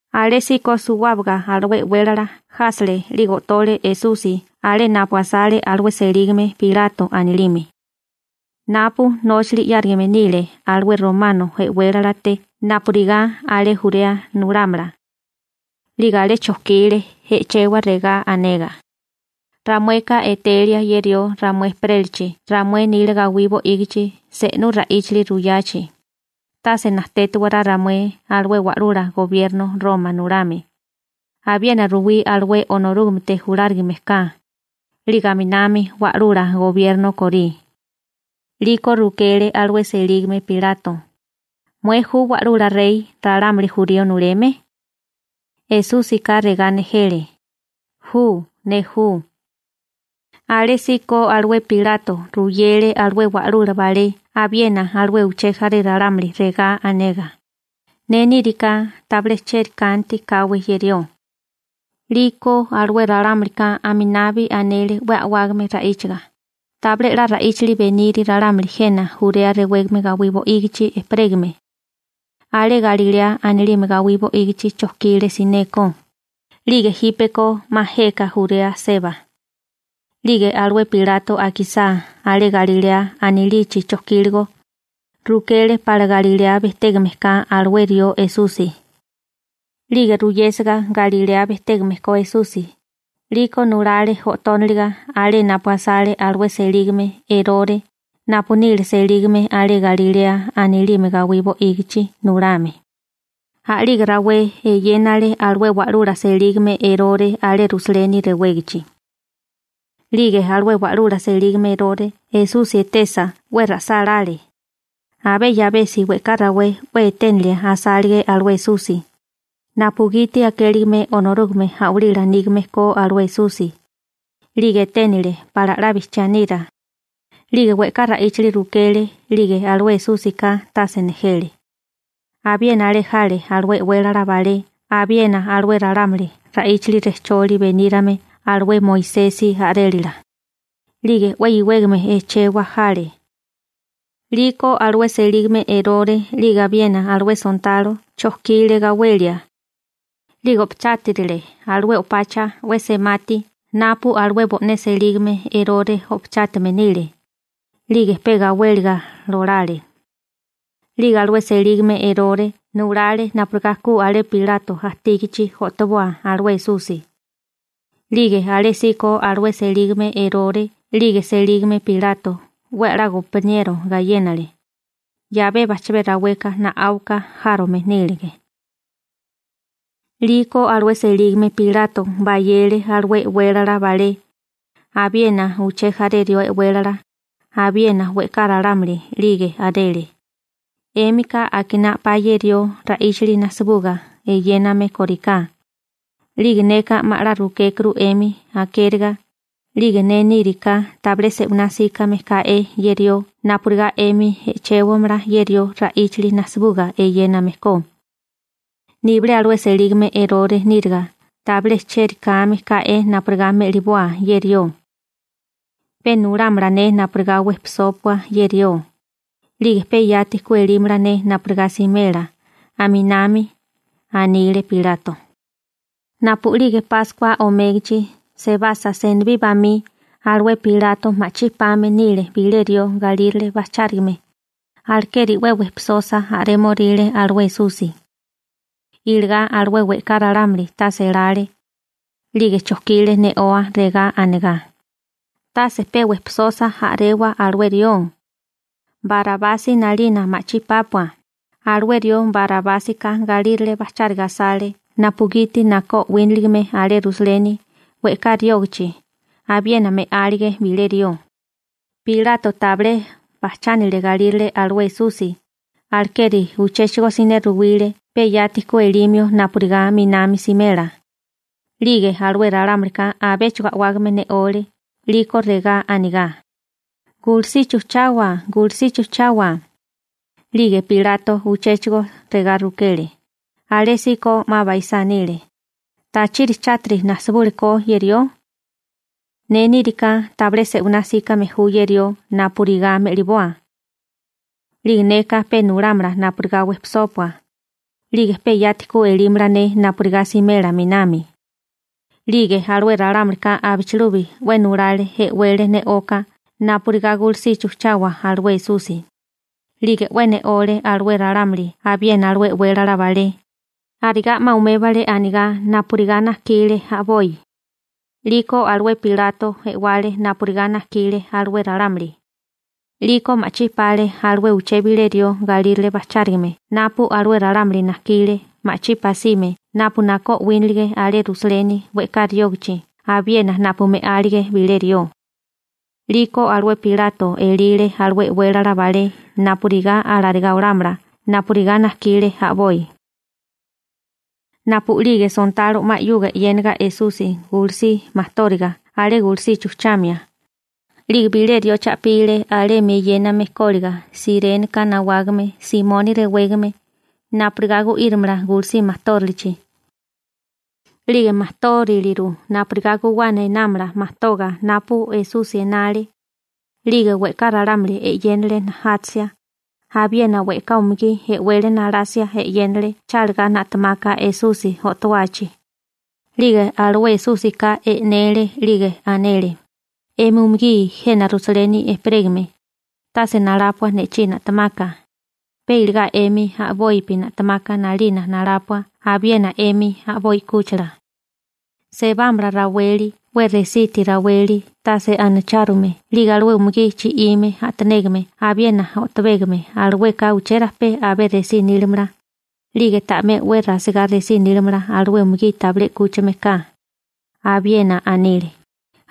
Alésíko suwábaga alué e'wélala jásele 'lige o'tole Esusi alé napu asale alué selígame Pilato anilime, napu nóchali 'yárigame nile alué romano e'wélalate napurigá alé Jurea nulámala. 'Lige alé chojkile e'chewa regá anegá: ―Ramueka etelia ye rió ramué ejperélachi ramué nila gawí bo'ígichi se'nú ra'íchali ruyachi, tase najtétiwará ramué alué wa'lula gobierno Roma nulame, abiena ruwí alué Onorúgamete julárigame ka, 'lige aminami wa'lula gobierno korí. 'Liko rukele alué selígame Pilato: ―¿Mué ju wa'lula rey ralámuli jurío nuleme? Esúsika regá nejele: ―Ju, ne ju. Alésíko alué Pilato ruyele alué wa'lula balé abiena alué uché jaré ralámuli regá anegá: ―Ne níriká, tabilé cheri kanti káwé ye rió. 'Liko alué ralámulika aminabi anele 'we a'wágame ra'íchaga: ―Tabilé 'la ra'íchali beniri ralámuli jena Jurea rewégame gawí bo'ígichi ejperégame. Alé Galilea anilime gawí bo'ígichi chojkile sineko, 'lige jípeko 'ma jeka Jurea seba. 'Lige alué Pilato akisá alé Galilea anilichi chojkíligo, rukele pala Galilea bejtégame ka alué rió Esusi. 'Lige ruyésiga Galilea bejtégame ko Esusi, 'liko nulale o'tóniliga alé napu asale alué selígame Erore napu nile selígame alé Galilea anilime gawí bo'ígichi nulame. A'lige rawé eyénale alué wa'lula selígame Erore alé Rusaleni rewégachi. 'Lige alué wa'lula selígame Erore Esusi etesa 'we ra'sálále. Abé 'yabesi we'ká rawé 'we eténilia asálige alué Esusi, napugiti akéligime Onorúgame a'walila nígame ko alué Esusi. 'Lige 'we eténile asálige pala 'la bijchiá ko a'walí nígame ko. 'Lige we'ká ra'íchali rukele 'lige alué Esúsika tase nejele. Abiena alé jale alué e'wélala balé abiena alué ralámuli ra'íchali rejcholi benírame alué Moisesi a'rélala, 'lige 'we iwégame e'chewa jale. 'Liko alué selígame Erore 'lige abiena alué sontalo chojkile gawelia. 'Lige o'pachátarile alué o'pacha 'we semati napu alué bo'né selígame Erore o'pachátame nile, 'lige pe gawéliga lolale. 'Lige alué selígame Erore nulale napurigá ku alé Pilato ajtígachi o'toboa alué Esusi. 'Lige alésíko alué selígame Erore 'lige selígame Pilato 'we a'lá gompaniero gayénale, 'yabé bajchabé raweka na'áuka járome nílige. 'Liko alué selígame Pilato bayele alué e'wélala balé, abiena uché jaré rió e'wélala, abiena we'ká ralámuli, 'lige anele: ―'Émika akiná a'pá ye rió ra'íchali najsibuga eyéname kóriká. 'Lige neka 'ma 'la rukékuru 'emi akériga, 'lige ne níriká tabilé se'winá 'síkame ká'é ye rió napurigá 'emi e'chewámala ye rió ra'íchali najsibuga eyéname ko. Nibilé alué selígame Erore níriga tabilé chieri kame ká'é napurigá me'liboa ye rió. Pe nulámala ne napurigá wejpisópua ye rió, 'lige pe yati ku elímala ne napurigá simela a'minami ―anile Pilato. Napu'lige Páskua omégachi sebasa senibí bamí, alué Pilato ma'chí pame nile bilé rió galírale bajchárigame, alekeri pe wejpisosa a'rémoríle alué Esusi. Iligá alué we'ká ralámuli tase elale, 'lige chojkile ne'oa regá anegá: ―¡Tase pe wejpisosa a'rewa alué rió! ¡Barabasi 'nalina ma'chí pápua! Alué rió Barabásika galírale bajcháriga asale napugiti nakó o'wínaligime alé Rusaleni we'ká riógachi abiena me'álige bilé rió. Pilato tabilé bajchánile galírale alué Esusi, alekeri uchéchigo siné ruwile pe yati ku elimio napurigá 'minami simela, 'lige alué ralámulika abéchigo a'wágame ne'ole 'liko regá anigá: ―¡Gulusichi ujchawa! ¡Gulusichi ujchawa! 'Lige Pilato uchéchigo regá anile, alésíko 'ma baisá nile: ―¿Tachiri chátiri nasibule ko ye rió? Ne níriká tabilé se'winá 'síkame ju ye rió napurigá me'liboa. 'Lige neka pe nulámala napurigá wejpisópua, 'lige pe yati ku elímala ne napurigá simela 'minami. 'Lige alué ralámulika abichilubi 'we nulale e'wele ne'oka napurigá gulusichi ujchawa alué Esusi. 'Lige 'we ne'ole alué ralámuli abiena alué e'wélala balé, arigá 'ma umébale anigá napurigá najkile a'boi. 'Liko alué Pilato e'wale napurigá najkile alué ralámuli. 'Liko ma'chí pale alué uché bilé rió galírale bajchárigame napu alué ralámuli najkile ma'chí pasime napu nakó o'wínalige alé Rusaleni we'ká riógachi abiena napu me'álige bilé rió. 'Liko alué Pilato elile alué e'wélala balé napurigá alarigá olámala napurigá najkile a'boi. Napu'lige sontalo 'ma 'yuga e'yéniga Esusi gulusí majtóriga alé gulusichi ujchamia, 'lige bilé rió cha'pile alemi eyéname kóliga Siréneka nawágame Simoni rewégame napurigá gu'írimala gulusí majtórilichi. 'Lige majtóriliru napurigá guwana enámala majtoga napu Esusi enale. 'Lige we'ká ralámuli e'yénale najátasia, abiena we'ká umugí e'wele nalasia e'yénale chálagá na'temaka Esusi o'towachi. 'Lige alué Esúsika e'nele 'lige anele: ―'Emi umugí jena Rusaleni ejperégame, tase nalápua ne'chí na'temaka, pe iligá 'emi a'bopi na'temaka 'nalina nalápua abiena 'emi a'boi 'kúchila. Sebámala raweli 'we resiti raweli tase anachárume 'lige alué umugí chi'ime a'tanégame abiena ojtabégame alueka uchérajpé abé resí nílimala, 'lige ta'mé 'we rasigá resí nílimala alué umugí tabilé 'kúchigame ka. Abiena anile: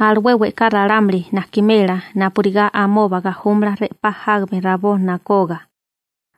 «Alué we'ká ralámuli najkimela napurigá amoba gajúmala re'pá jágame rabó nokogá.»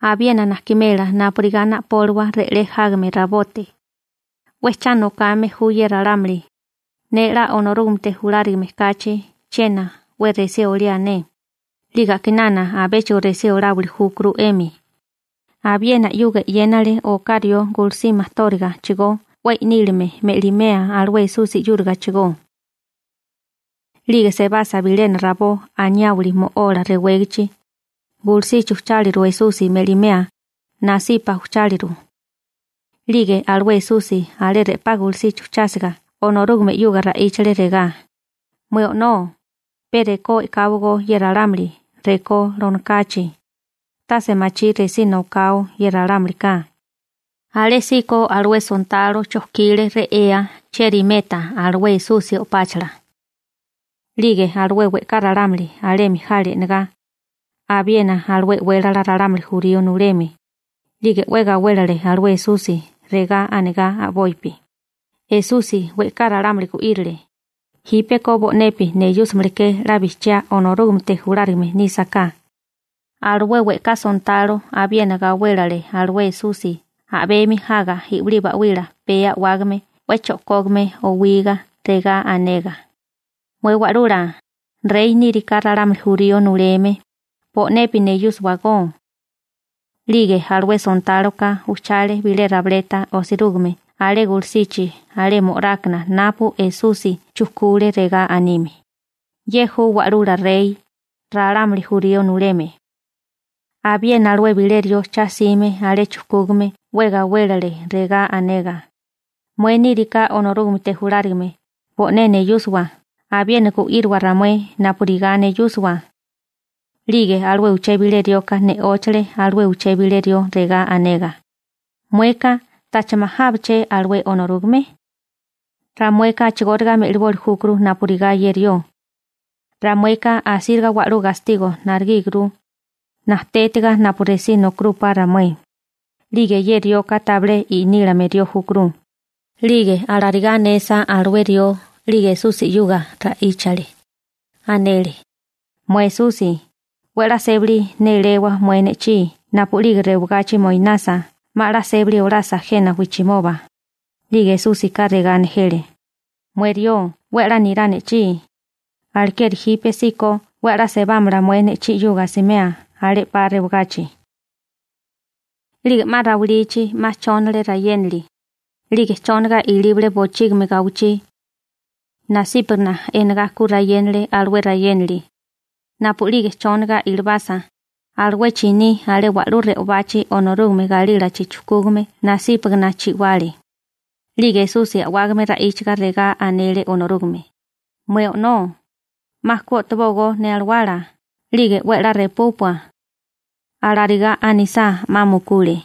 «Abiena najkimela napurigá na'póliwa re'lé jágame rabote.» 'We cha nokame ju ye ralámuli, ne 'la Onorúgamete julárigame kachi chiena 'we resí oliá ne, 'lige a'kinana abéchigo resí oláwili júkuru 'emi. Abiena 'yuga e'yénale oká rió gulusí majtórigachigó 'we i'nílime me'limea alué Esusi 'yúrigachigó. 'Lige sebasa bilena rabó Anayáwali Mo'ola rewégachi, gulusichi ujcháliru Esusi me'limea, nasipa ujcháliru. 'Lige alué Esusi alé re'pá gulusichi ujchásiga Onorúgame 'yuga ra'íchale regá: ―Mué O'nó, pe rekó e'káwagó ye ralámuli rekó lonokachi, tase machí resí nokao ye ralámulika. Alésíko alué sontáloka chojkile re'ea chieri meta alué Esusi o'páchala. 'Lige alué we'ká ralámuli alemi jale e'negá, abiena alué e'wélala ralámuli jurío nuleme, 'lige 'we gawélele alué Esusi, regá anegá a'bopi: ―Esusi we'ká ralámuli gu'írile, jípeko bo'nepi neyúsamale ke 'la bijchiá Onorúgamete julárigame nísaká. Alué we'ká sontalo abiena gawélele alué Esusi a'bemi jaga i'wilí ba'wila pee a'wágame 'we cho'kógame owigá regá anegá: ―Mué Wa'lula, rey níriká ralámuli jurío nuleme, bo'nepi neyúsiwagó. 'Lige alué sontáloka ujchale bilé rabileta osirúgime alé gulusichi alé mo'rákana napu Esusi chujkule regá anime: «Ye ju wa'lula rey, ralámuli jurío nuleme.» Abiena alué bilé rió cha 'sime alé chujkúgame 'we gawélele, regá anegá: ―¡Mué níriká Onorúgamete julárigame, bo'né neyúsiwa, abiena gu'íriwa ramué napurigá neyúsiwa! 'Lige alué uché bilé rioka ne'óchale alué uché bilé rió, regá anegá: ―Mueka ¿tacha majawáché alué Onorúgame? Ramueka a'chigóriga me'liboli júkuru napurigá ye rió. Ramueka asíriga wa'lú gastigo narigíguru, najtétiga napu resí nokarúpá ramué. 'Lige ye rioka tabilé inílame rió júkuru. 'Lige alarigá anesa alué rió 'lige Esusi 'yuga ra'íchale. Anele: ―Mué Esusi, 'we a'lá sébali néléwa mué ne'chí napu'lige rewagachi moinasa 'ma 'la sébali olasa jena wijchimoba. 'Lige Esúsika regá nejele: ―Mué rió 'we a'lá nirá ne'chí, alekeri jípesíko 'we a'lá sebámala mué ne'chí 'yuga asimea alé 'pa rewagachi. 'Lige 'ma rawilichi 'ma chónale rayénali, 'lige chónaga ilíbale bochígimi gawichí. Nasípagana enagá ku rayénale alué rayénali. Napu'lige chóniga ilibasa, alué chiní alé wa'lú re'obachi Onorúgame galílachi chujkúgame nasípagana chi'wale. 'Lige Esusi a'wágame ra'íchaga regá anele Onorúgame: ―Mué O'nó, 'ma ku o'tobógó ne alawala, 'lige 'we 'la repúpua. Alarigá anisá, 'ma mukule.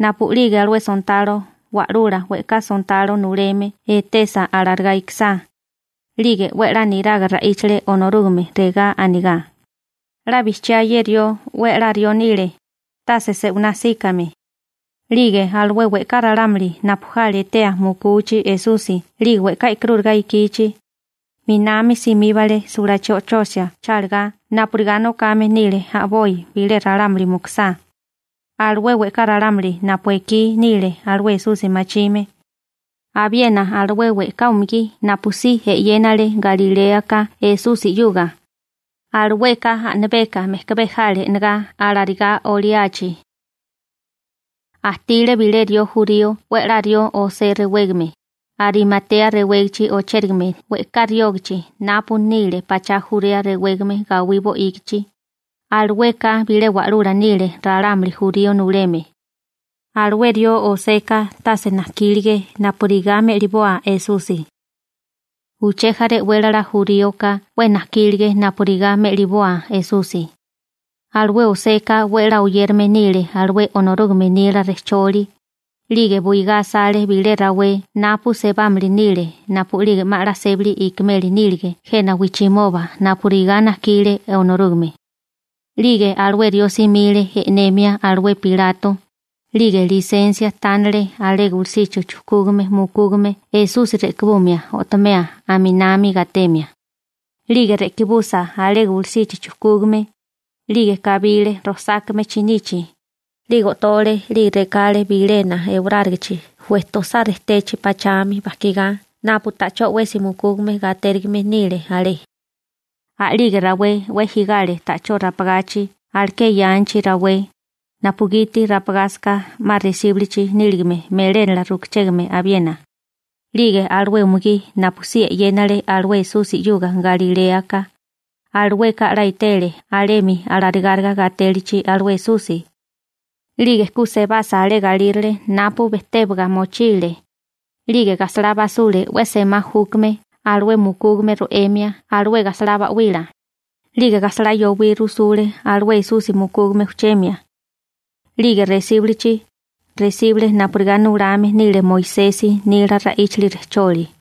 Napu'lige alué sontalo wa'lula we'ká sontalo nuleme etesa alarigá ikisá, 'lige 'we a'lá niraga ra'íchale Onorúgame regá anigá: ―'La bijchiá ye rió 'we a'lá rió nile, tase se'winá 'síkame. 'Lige alué we'ká ralámuli napu jale etea mukuchi Esusi 'lige we'ká e'karúriga ikichi, 'minami simíbale sulachí o'chosia chálagá napurigá nokame nile a'boi bile ralámuli mukusá. Alué we'ká ralámuli napu ekí nile alué Esusi machime, abiena alué we'ká umugí napu si e'yénale Galiléaka Esusi 'yuga, alueka a'nabeka mejkabé jale e'negá alarigá oliachi. Ajtile bilé rió jurío 'we a'lá rió José rewégame, Arimatea rewégachi ochérigame we'ká riógachi napu nile pachá Jurea rewégame gawí bo'ígichi, alueka bilé wa'lula nile ralámuli jurío nuleme. Alué rió Joseka tase najkílige napurigá me'liboa Esusi. Uché jaré e'wélala juríoka 'we najkílige napurigá me'liboa Esusi. Alué Joseka 'we a'lá oyérame nile alué Onorúgame nila rejcholi, 'lige buigá asale bilé rawé napu sebámili nile napu'lige 'ma 'la sébali ikimeli nílige jena wijchimoba napurigá najkile Onorúgame. 'Lige alué rió simile e'nemia alué Pilato, 'lige lisensia tánale alé gulusichi chujkúgame mukúgame Esusi re'kibumia o'tomea a'minami gatemia. 'Lige re'kibusa alé gulusichi chujkúgame, 'lige kabile rojsákame chinichi, 'lige o'tole 'lige rekale bilena ewarárigichi wejtosá rejtechi pachami bajkigá napu ta'chó 'wesi mukúgame gatérigime nile alé. A'lige rawé 'we jigale ta'chó rapagachi alaké yanchi rawé, napugiti rapagásaká 'ma resíbilichi níligame melénala rukuchégame abiena. 'Lige alué umugí napu si e'yénale alué Esusi 'yuga Galiléaka, alueka 'la etele alemi alarigáriga gatélichi alué Esusi. 'Lige ku sebasa alé galírale napu bejtébaga mochile, 'lige gajsalá basule 'we semá júkame alué mukúgame ro'emia alué gajsalá ba'wila, 'lige gajsalá yowí rusule alué Esusi mukúgame ujchemia. 'Lige resíbulichi, resíbale napurigá nulame nile Moisesi nila ra'íchali rejcholi.